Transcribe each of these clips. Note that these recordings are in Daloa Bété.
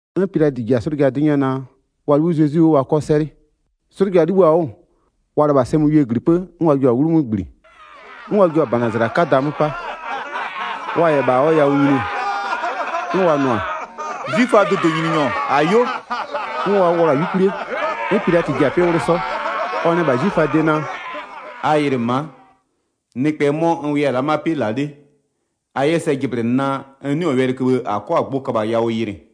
'N Pilatɩ ji-a 'slʋja 'dɩ 'nyɛ naa, wa 'libhï Zezwi 'wʋ, wa 'kɔ 'sɛlɩ. 'Slʋja 'libhïɔ-a 'wʋ, wa lɩbha-a sɛmöwiee -glipë, 'n wa jio-a 'wlumö -gbli, 'n wa jio-a -bana -zala 'kada 'mö 'pa. Wa -yɛ -bha ɔ yawʋ nyini, 'n wa nʋ-a: “'Zwiföaa dʋdʋnyininyɔ, -ayo.” 'N wa 'wlɔ-a 'yukwlie. 'N Pilatɩ ji-a 'pɩ 'wlʋ 'sɔ, ɔ nɛ -bha 'zwiföaa de naa: “A yɩlɩ ma'a, nɩkpɛ 'mɔ n wʋya-a la'a ma'a 'pɩ -la 'le, a 'yɛ sɛ jɩblɩnɩ naa, n 'nɩɔ-ɔ wɛlɩköbhë -a 'kɔ-a gbʋ köbha yawʋ yɩlɩ.”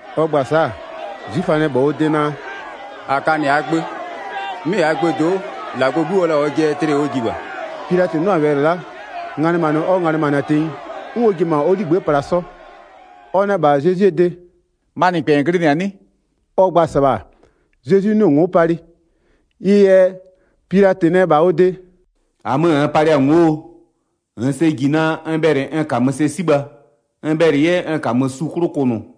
Ɔ gba-a sa'a, 'zwiföa nɛ -bha ɔ de naa: “-A ka -nɩ -aa gbö. 'Mɩ -aa gböö do'o, -Lagɔɔ 'Gu ɔ la-a ɔjɩɛ yɛ tlɩɛ ɔ ji -bha.” Pilatɩ 'nʋ-a wɛlɩ la'a, nganɩmanɩ ɔ nganɩmanɩ-a tenyi. 'N ɔ ji-e -ma ɔ 'ligbë'ë pla 'sɔ. Ɔ nɛ -bha Zezwie de: “Ma -nɩkpɛ -n glɩnɩ-a 'nɩ?” Ɔ gba-a -sɩbha, Zezwi 'nɩɔ-ɔ ngo'o palɩ. Ɩ yɛ Pilatɩ nɛ -bha ɔ de: “-Amö -nn palɩ-a ngo'oo? -Nn sɛ -ji naa, n bhɛlɩ n -kamö sɛ 'sibha, n bhɛlɩ 'yɛ n -kamö su 'klʋ kʋnʋ?”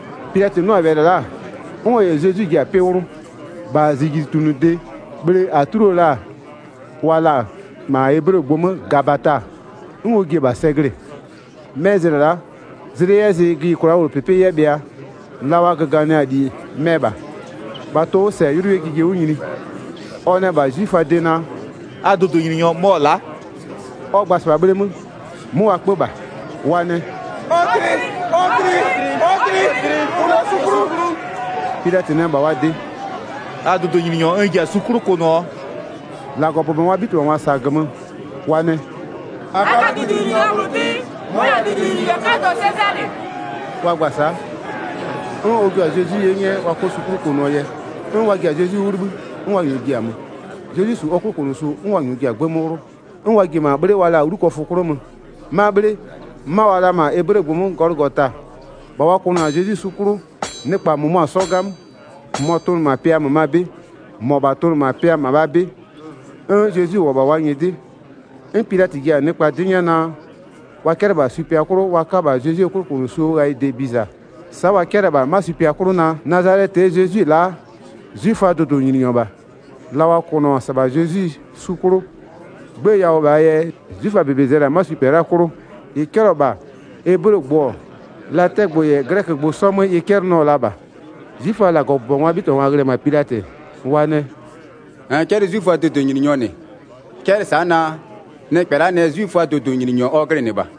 Pilatɩ 'nʋ-a wɛlɩ la'a, 'n ɔ -yɛ Zezwi ji-a 'pɩ 'wlʋ. -Bha -zijlitunʋde bhle -a 'tlio la-a wa la-a -ma eblegbʋ 'mö Gabata, 'n ɔ ji-e -bha sɛ glɩ-ɩ. 'Mɛ zlɩ la'a, zlɩ 'yɛ zɩ gïyikwlaa 'möwlʋpɩpɩ 'yɛ bhɩa, la wa göganɩ-a -li mɛ -bha. -Bha tʋ-ʋ 'wʋ -sɛ 'ylʋ 'yɛ jije 'wʋ nyini. Ɔ nɛ -bha 'zwiföaa de naa: “A dʋdʋnyininyɔ mɔ-ɔ la'a.” Ɔ gba-a -sɩbha bhleemö, 'mö wa 'kpö -bha. Wa nɛ: “Ɔ tlɩ! Ɔ tlɩ! Ɔ tlɩ! Kʋnʋɔ su 'klʋ!” Pilatɩ nɛ -bha wa de: “A dʋdʋnyininyɔ n ji-a su 'klʋ kʋnʋɔ?” -Lagɔbʋbɔngwaa 'bhitɩbhangwa -sa-a -gömö, wa nɛ: “-A ka dʋdʋnyininyɔ -bhlʋ 'tɩ, mɔ-ɔ -yɛ-a dʋdʋnyininyɔ Sezalɩ 'kadɔ.” Wa gba-a sa'a, 'n ɔ jua-a Zezwi 'ye 'nyɛ wa 'kɔ su 'klʋ kʋnʋɔ yɛ. 'N wa ji-a Zezwi 'wʋ 'libhï 'n wa -nyɔɔ ji-a mö. Zezwi -su ɔ 'klʋkʋnʋsu, 'n wa -nyɔɔ ji-a 'gbë 'mö 'wlʋ, 'n wa ji-e -ma 'bhle -bhlʋ wa la-a 'Wlukɔfʋ 'klʋ mö. 'Ma 'bhle 'ma wa la-a -ma eblegbʋ 'mö Gɔlʋgota. 18-Bha wa kʋnʋ-a Zezwi su 'klʋ, nɩkpa -mʋmʋa 'sɔ 'gamö, -mʋmɔ tʋnʋ -ma pɩa -mömaa 'bɩ, -mɔbha tʋnʋ -ma pɩa -mabhaa 'bɩ 'n Zezwi -wʋ-ɔ -bha wa nyɩdɩ. 'N Pilatɩ ji-a nɩkpa 'dɩ 'nyɛ naa, wa 'cɛlɩ -bha supɩa 'klʋ wa 'ka -bha Zezwie 'klʋkʋnʋsuo ghayɩde biza. Sa'a wa 'cɛlɩ-ɛ -bha 'ma supɩa 'klʋ naa: “Nazalɛtɩɛ Zezwi-e la'a, 'zwiföaa dʋdʋnyininyɔ -bha.” La wa kʋnʋ-ɔ -sɩbha Zezwi su 'klʋ 'gbë yawʋ -bhaa yɛ 'zwiföaa -bebe zɛlɩ-a 'ma supɩa la'a 'klʋ, -ɩ 'cɛlɩɔ-ɔ -bha, eblegbʋ-ɔ, latɛgbʋ -yɛ 'glɛkögbʋ 'sɔ 'mö ɩ 'cɛlɩnɩɔ la -bha. 'Zwiföaa -Lagɔbʋbɔngwaa 'bhitɩbhangwa ghlɩ-ɛ -ma Pilatɩ, wa nɛ: “-Nn 'cɛlɩ 'zwiföaa dʋdʋnyininyɔ -nɩ. 'Cɛlɩ sa'a naa: nɩkpɛ la'a nɛ 'zwiföaa dʋdʋnyininyɔ ɔ glɩnɩ -bha.”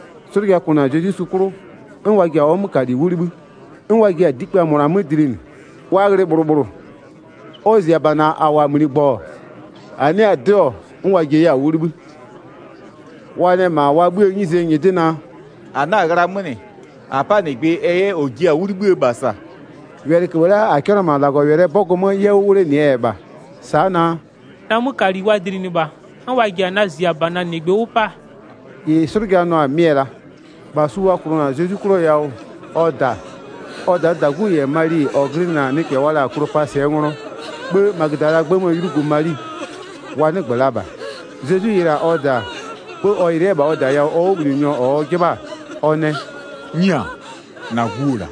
'Slʋja kʋnʋ-a Zezwi su 'klʋ, 'n wa ji-a ɔ 'mökali 'wʋ 'libhï, 'n wa jiɩ-a dikpïa -mʋna 'mö dlinɩ. Wa ghlɩ -bhlʋ -bhlʋ. Ɔ -ziabana -a -wʋ-a -mligbɔ-ɔ, -a 'nɩ-a 'dɩɔ-ɔ 'n wa jia 'yɛ-a 'wʋ 'libhï. Wa nɛ -ma wa 'bhïë 'nyizee nyɩdɩ naa: “-A 'na-a ghlaa 'mö -nɩ, -a 'pa -nɩgbɩ ɛ 'yɛ -ɔ jia-a 'wʋ 'libhï -bha -sa.” Wɛlɩköbhë la'a -a 'cɛlɩɔ-ɔ -ma -Lagɔwɛlɩɛ 'bɔgʋ 'mö 'yɛ 'wʋ 'wlenɩɛ yɛ -bha. Sa'a naa: “Na 'mökali wa dlinɩ -bha, 'n wa ji-a na -ziabana -nɩgbɩ 'wʋ 'pa.” -Ɩ 'slʋja nʋ-a mɩ-ɛ -la. 25-Bha su wa kʋnʋ-a Zezwi 'klʋɔ yawʋ, ɔ -da, ɔ -daa -dagu -yɛ Mali -ɔ glɩnɩ-a nɩkpɛ wa la-a Klopasɩɛ nglɔ, 'bhë Magödalaa 'gbë 'möö 'ylugu Mali, wa 'nɩgbö la -bha. Zezwi yɩlɩ-a ɔ -da, 'bhë ɔ yɩlɩ 'yɛ-ɛ -bha ɔ -da yawʋ ɔ 'wʋbhlinɩnyɔ -ɔ ɔ 'jɩbha-a, ɔ nɛ: “'Nyia, -na gu-o -la.”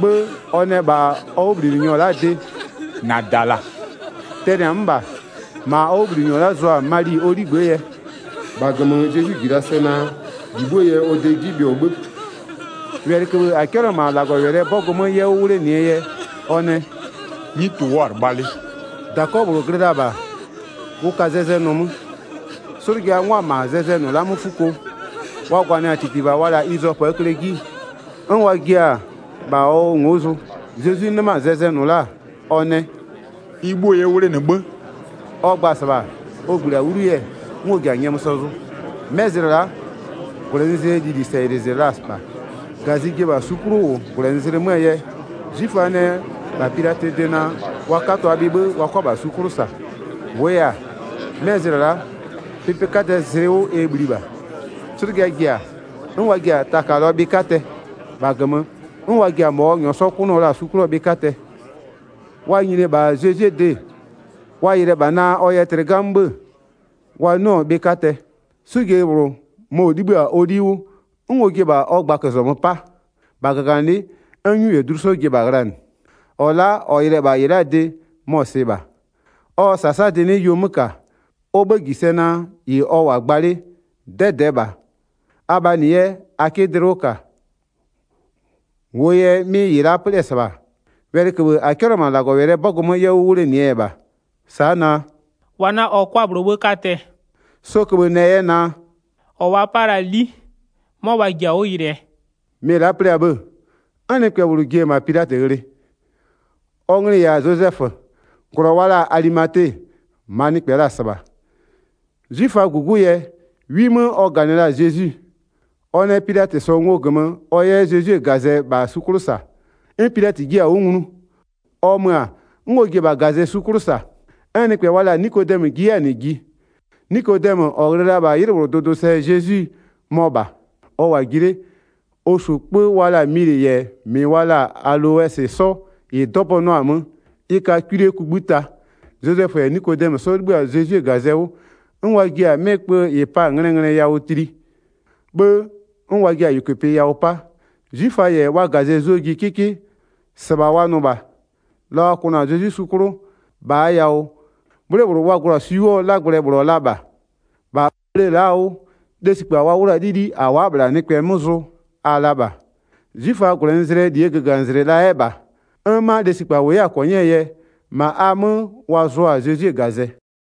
'Bhë ɔ nɛ -bha ɔ 'wʋbhlinɩnyɔ la'aa de: “-Na -da-a -la.” Tɛnɩ-a 'mö -bha, -ma ɔ 'wʋbhlinɩnyɔ la'a zʋ-a Mali ɔ 'ligbë'ë yɛ. Zezwi yɛ nyɔmʋ sɛ zʋ 28-Bha -gömö Zezwi -ji la sɛ naa, -li 'bhuo yɛ ɔ de 'ji bhɩɔ 'bhë, wɛlɩköbhë -a 'cɛlɩɔ-ɔ -ma -Lagɔwɛlɩɛ 'bɔgʋ 'mö 'yɛ 'wʋ 'wlenɩɛ yɛ, ɔ nɛ: “'Nyutʋ-ʋ wʋ'ʋ-a 'lɩbha 'le.” 29-Dakɔ -bhlʋ glɩ la-a -bha, ʋ ka zɛzɛnʋ 'mö. 'Slʋja 'ngwa-a -ma zɛzɛnʋ la'a 'mö 'fuko, wa gwanɩa-a -titiva wa la-a izɔpöö kle 'ji, 'n wa jia-a -bha ɔ ngo'o zʋ. Zezwi 'nɩma-a zɛzɛnʋ la'a, ɔ nɛ: “Ɩ 'bhuo yɛ 'wʋ 'wlenɩ 'bhë.” Ɔ gba-a -sɩbha, ɔ -gbli-a 'wlu yɛ, 'n ɔ ji-a nyɔmʋ sɛ zʋ. 'Mɛ zlɩ la'a, -gwlɛnɩzlɩɛ lilie sɛyɩlɩzlɩ la -bha. -Gazɩ ji-e -bha su 'klʋ -wʋ -gwlɛnɩzlɩ 'möö yɛ, 'zwiföa nɛ -bha Pilatɩɛ de naa, wa 'katʋa bhɩ 'bhë wa 'kʋa -bha su 'klʋ -sa. -Wʋʋ yɛ-a, 'mɛ zlɩ la'a, pɩpɩ 'kadɛɛ zlɩ 'wʋ ɛ bhli -bha. 'Slʋja ji-a, 'n wa ji-a takalɔɔ bhɩ 'katɛ, -bha -gömö 'n wa ji-a -mɔ ɔ -nyɔɔ 'sɔ 'kʋnʋɔ la-a su 'klʋɔ bhɩ 'katɛ. Wa nyini-e -bha Zezwie de, wa yɩlɩ-ɛ -bha naa ɔ yɛ tlɩ 'gamö 'bhë-ë, wa 'nɩɔ-ɔ bhɩ 'katɛ. 'Slʋjeyi -bhlʋ, mɔ-ɔ 'libhï-a ɔ 'li 'wʋ 'n ɔ jie-e -bha ɔ gbaközɔmö 'pa. -Bha -gaganɩlɩ'ɩ, 'n 'nyu -yɛ dlu 'sɔ ji-e -bha ghlanɩ. 35-Ɔ la'a -ɔ yɩlɩ-ɛ -bha -ɩ la'aa de, mɔ-ɔ -sɩɩ -bha, ɔ -sasadɩ 'nɩ yuo 'mö -ka, ɔ 'bhë -ji sɛ naa -ɩ ɔ -wʋ-a gba 'le 'dɛdɛɛ -bha, abhaa -nɩ 'yɛ a 'kɩ dlɩ 'wʋ -ka. 36-Wʋʋ yɛ 'mɩ -ɩ la'a 'plɩ-ɛ -sɩbha, wɛlɩköbhë -a 'cɛlɩɔ-ɔ -ma -Lagɔwɛlɩɛ 'bɔgʋ 'mö 'yɛ 'wʋ 'wlenɩɛ yɛ -bha. Sa'a naa: “Wa 'na ɔ 'kwa -bhlʋɔ 'bhë 'katɛ.” 'Sɔ köbhë nɛ 'yɛ naa: “-Ɔ wa 'pa la-a 'li, 'mɔ wa ji-a 'wʋ yɩlɩɛ.” 'Mɩ -ɩ la'a 'plɩ-a 'bhë-ë, 'n nɩkpɛ -bhlʋ ji-e -ma Pilatɩ ghlɩ. Ɔ nglɩ-ɩ -yɛ-a Zozɛfö, -glɔ wa la-a Alimate, -maa nɩkpɛ la-a -sɩbha. 'Zwiföaa -gugu yɛ, 'wi 'mö ɔ -ganɩ la-a Zezwi. Ɔ nɛ Pilatɩ -sɔɔ ngo -gömö, ɔ 'yɛ Zezwie -gazɛ -bha su 'klʋ -sa. 'N Pilatɩ jiɩ-a 'wʋ nglu. Ɔ mö-a, 'n ɔ ji-e -bha -gazɛ su 'klʋ -sa. 'N nɩkpɛ wa la-a Nikodɛmö ji 'yɛ-a -nɩ ji. Nikodɛmö -ɔ ghlɩ la-a -bha 'ylɩ -bhlʋɔ dʋdʋsɛ Zezwi, mɔ -bha. Ɔ -wʋ-a ji 'le, ɔ -su 'kpö wa la-a milɩ -yɛ -mɩ wa la-a aloɛsɩ sɔ -ɩ 'dɔbɔnʋɔ-a 'mö. Ɩ ka kwilie kugbïta. Zozɛfö -yɛ Nikodɛmö 'sɔ 'libhï-a Zezwie -gazɛ 'wʋ, 'n wa jiɛ-a 'mɩ kpö -ɩ pa-a nglɛɛ nglɛ yawʋ tli, 'bhë 'n wa jiɛ-a -yʋkʋpɩ yawʋ 'pa. 'Zwiföa -yɛ wa -gazɩ zʋɔ ji 'kɩkɩ -sɩbha wa nʋ -bha. La wa kʋnʋ-a Zezwi su 'klʋ, -bhaa yawʋ 'bhle -bhlʋ wa glʋ-a swi 'wʋɔ 'lagblɛ -bhlʋ-ɔ la -bha, -bha bhle la'aa 'wʋ lesikpa wa 'wlu-a 'lili'i -a wa'a-a -bhla nɩkpɛ 'mö zʋ-ɔ la -bha. 'Zwiföaa -gwlɛnɩzlɩɛ -ligöganɩzlɩ la 'yɛ -bha, 'n 'ma lesikpa -wʋ 'yɛ-a -kɔnyɩɛ yɛ, -ma a 'mö wa zʋ-a Zezwie -gazɛ.